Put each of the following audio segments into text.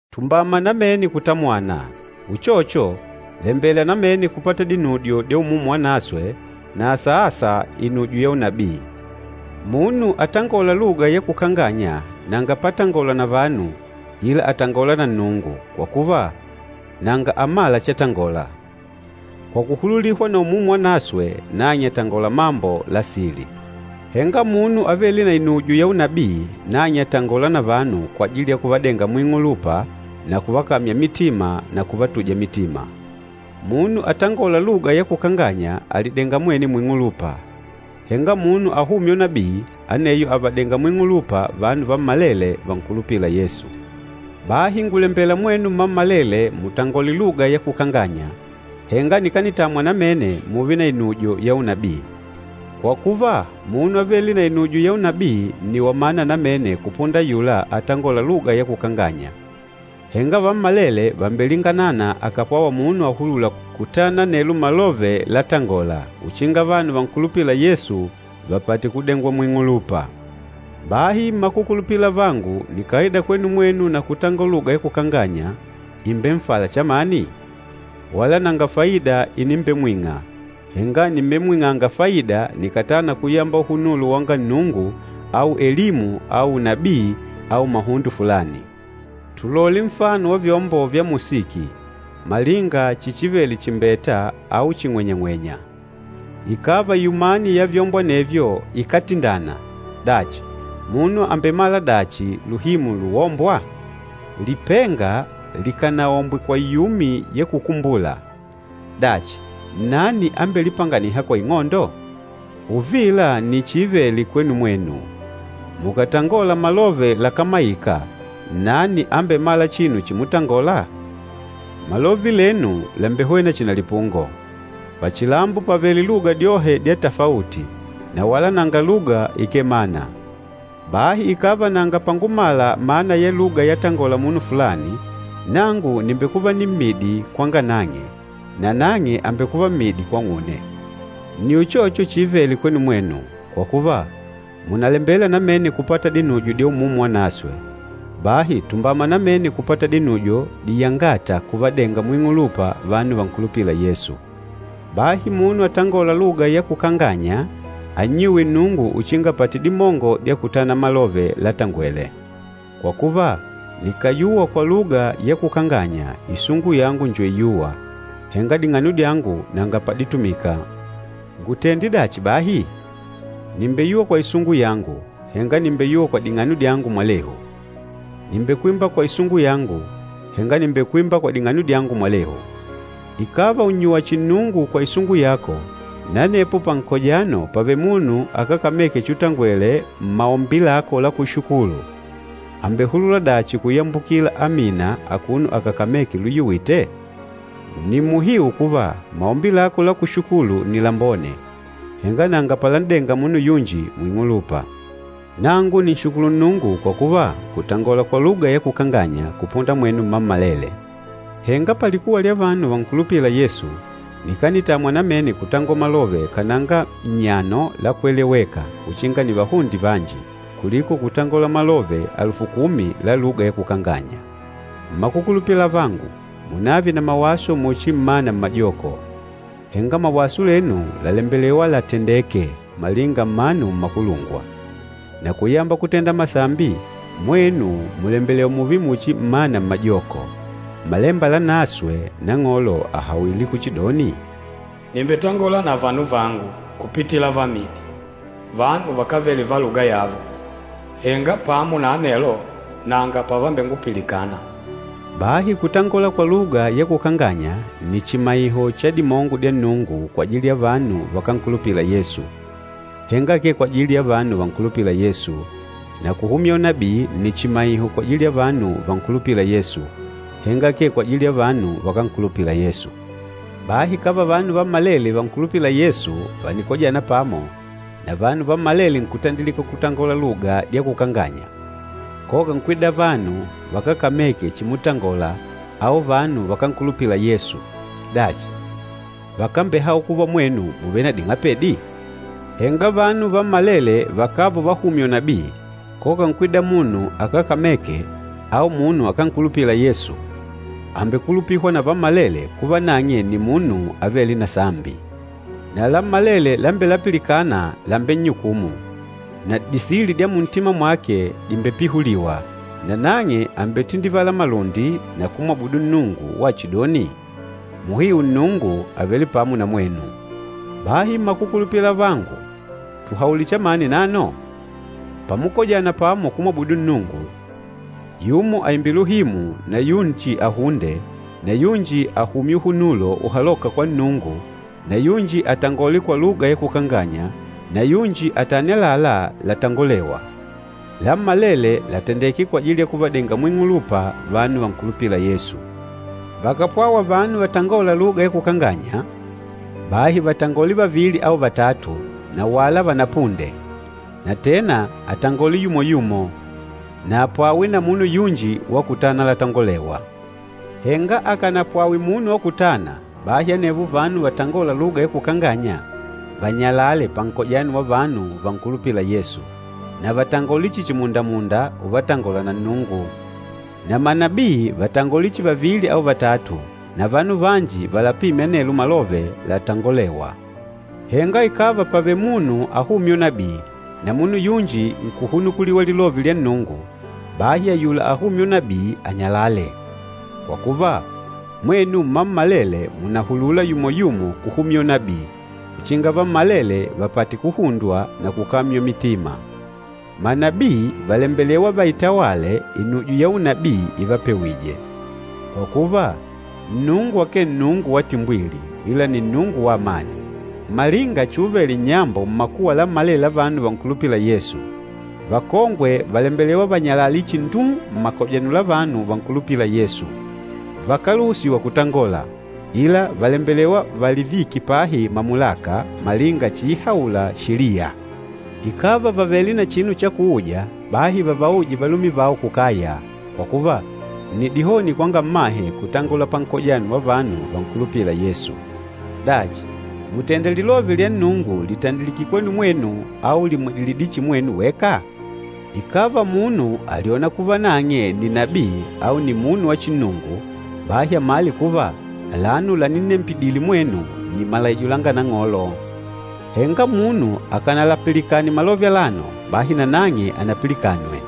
Tumbama namene kutamwana. Uchocho, lembela namene kupata dinujo dya Umumu Wanaswe na asa-asa inujo ya unabii. Munu atangôla luga ya kukanganya nanga patangola na vanu ila àtangola na Nnungu, kwa kuva, nanga amâla chatangola. Kwa kuhululihwa na Umumu Wanaswe nang'e àtangola mambo la sili. Henga munu avêle na inujo ya unabii, nang'e àtangola na vanu kwajili ya kuvadenga muing'ulupa na kuvakamya mitima na kuvatuja mitima. Munu atangôla luga ya kukanganya àlidenga mwene muing'ulupa. Henga munu ahûmya unabii, aneyo àvadenga muing'ulupa vanu vammalele vankulupîla Yesu. Bahi ngùlembela mwenu mmammalele mutangole luga ya kukanganya, henga nikanitamwa namene mùùve na inujo ya unabii. Kwa kuva, munu avêle na inujo ya unabii nni wamana namene kupunda ayula atangôla luga ya kukanganya, henga vammalele vàmbelinganana akàpwawa munu ahulûla kutana anelo malove latangôla, uchinga vanu vankulupîla Yesu vapate kudengwa muing'ulupa. Bahi mmakukulupila avangu, nikàida kwenu mwenu na kutangola luga ya kukanganya, ìmbenfala chamani? Wala nanga faida inimbemwing'a, henga nìmbemwing'anga faida nikàtana kuyamba uhunulo wanga Nnungu au elimu au unabii au mahundo fulani. Tulole nfano wa vyombo vya musiki, malinga chichivele chimbeta au ching'wenyang'wenya. Ikàva iumani ya vyombo anevyo ikátindana, dachi, munu àmbemala dachi luhimu luwombwa? Lipenga likànaombwe kwa iumi ya kukumbula, dachi, nnani ambelipanganîha kwa ing'ondo? Uvila nni chiivele kwenu mwenu. Mukàtangola malove lakámaika, nnani ambemâla chinu chimutangola? Malove lenu làmbehwena chihi na lipungo. Pachilambo pàvele luga dyohe dya tafauti, na wala nanga luga ikee na mana. Bahi ikàva nanga pangumala mana ya luga yatangola munu fulani, nangu nìmbekuva nimmidi kwanga nang'e nanang'e àmbekuva mmidi kwang'une. Nni uchocho chiivele kwenu mwenu. Kwa kuva, mùnalembela namene kupata dinujo dya Umumu Wanaswe, bahi tumbama namene kupata dinujo diyangâta kuvadenga muing'ulupa vanu vankulupîla Yesu. Bahi munu atangôla luga ya kukanganya annyuwe Nnungu uchinga apate dimongo dya kutana malove latangwele. Kwa kuva, nikàyuwa kwa luga ya kukanganya isungu yangu njo iyûwa, henga ding'ano dyangu nanga paditumika. Ngutende dachi bahi? Nìmbeyuwa kwa isungu yangu, henga nìmbeyuwa kwa ding'ano dyangu mwalehu. Nìmbekwimba kwa isungu yangu, henga nìmbekwimba kwa ding'ano dyangu mwalehu. Ikàva ùnnyuwa chihi Nnungu kwa isungu yako, na anepo pankojano pàvele munu akákameke chutangwele mmaombi lako la kushukulu, àmbehulula dachi kuyambukila “Amina” akuno akákameke luyuwite? Nni muhiu kuva, maombi lako la kushukulu nni lambone, henga nanga palan'denga munu yunji muing'ulupa. Nangu nìnshukulu Nnungu kwa kuva ngùtangola kwa luga ya kukanganya kupunda mwenu mmammalele. Henga palikuwa lya vanu vankulupîla Yesu nikanitamwa namene kutangola malove kananga nnyano la kweleweka uchinga nivahunde vanji, kuliko kutangola malove alufu kumi la luga ya kukanganya. Mmakukulupila avangu, munave na mawaso muchi mmana mmajoko. Henga mawaso lenu làlembelewa latandeke malinga mmanu mmakulungwa. Na kuyamba kutenda masambi, mwenu mùlembelewa mùùve muchi mmana mmajoko. Mmalemba Lanaswe Nang'olo àhawile kuchidoni, “Nìmbetangola na vanu vangu, kupitila vamidi, vanu vakávele va luga yavo, henga pamo na anelo nanga pavambengupilikana.” Bahi kutangola kwa luga ya kukanganya nni chimaiho cha dimongo dya Nnungu kwajili ya vanu vakánkulupila Yesu, henga akee kwajili ya vanu vankulupîla Yesu. Na kuhumya unabii nni chimaiho kwajili ya vanu vankulupîla Yesu, henga akee kwajili ya vanu vakánkulupila Yesu. Bahi ikàva vanu vammalele vankulupîla Yesu vànikojana pamo, na vanu vammalele nkutandilika kutangola luga dya kukanganya, koka nkwida vanu vakákameke chimutangola au vanu vakánkulupila Yesu, dachi, vakambehaula kuva mwenu mùvele na ding'apedi? Henga vanu vammalele vakàva uvahumya unabii, koka nkwida munu akákameke au munu akánkulupila Yesu, àmbekulupihwa na vammalele kuva nang'e nni munu avêle na sambi. Na lammalele lambelapilikana làmbennyukumu, na disili dya muntima mwake dìmbepihuliwa, nanang'e àmbetindivala malundi na kumwabudu Nnungu wachidoni, “Muhiu Nnungu àvele pamo na mwenu.” Bahi mmakukulupila avangu, tuhaule chamani nano? Pamukojana pamo kumwabudu Nnungu, yumo aimbe luhimu na yunji ahunde na yunji ahumye uhunulo uhalôka kwa Nnungu na yunji atangole kwa luga ya kukanganya na yunji atane àlalá latangolewa. Lammalele latendeke kwajili ya kuvadenga muing'ulupa vanu vankulupîla Yesu. Vakàpwawa vanu vatangôla luga ya kukanganya, bahi vatangole vavili au vatatu na wala vanapunde, na tena atangole yumo-yumo, na apwawe na munu yunji wa kutana latangolewa. Henga akanapwawe munu wa kutana, bahi anevo vanu vatangôla luga ya kukanganya vanyalale pankojano wa vanu vankulupîla Yesu, na vatangole chihi chimundamunda uvatangola na Nnungu. Na manabii vatangole chihi vavili au vatatu na vanu vanji valapime anelo malove latangolêwa. Henga ikàva pàvele munu ahumya unabii, na munu yunji nkuhunukuliwa lilove lya Nnungu, bahi ayula ahumya unabii, anyalale. Kwa kuva, mwenu mmammalele mùnahulula yumo-yumo kuhumya unabii, uchinga vammalele vapate kuhundwa na kukamywa mitima. Manabii vàlembelewa vaitawale inujo ya unabii ivapewije. Kwa kuva, Nnungu akee Nnungu wa timbwili, ila nni Nnungu wa amani. Malinga chuuvele nnyambo mmakuwa lammalele la vanu vankulupîla Yesu, vakongwe vàlembelewa vanyalale chihi nduu mmakojano la vanu vankulupîla Yesu. Vakáluhusiwa kutangola, ila vàlembelewa valivike pahi mamulaka, malinga chiihaula Sheliya. Ikàva vàvele na chinu cha kuuja, bahi vavauje valume vao kukaya, kwa kuva, nni dihoni kwanga mmahe kutangola pankojano wa vanu vankulupîla Yesu. Dachi, mùtenda lilove lya Nnungu lìtandikidile kwenu mwenu au lìmwidilidile chihi mwenu weka? Ikàva munu àlyona kuva nang'e nni nabii au nni munu wa chinnungu, bahi amale kuva alano laninnembidile mwenu nni malaijo langa Nang'olo. Henga munu akanalapilikane malove alano, bahi nanang'e anapilikanwe.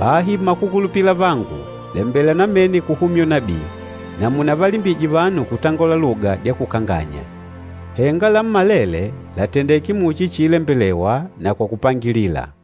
Bahi mmakukulupila avangu, lembela namene kuhumya unabii, na munavalimbije vanu kutangola luga dya kukanganya. Henga lammalele làtendeke muchi chiilembelewa na kwa kupangilila.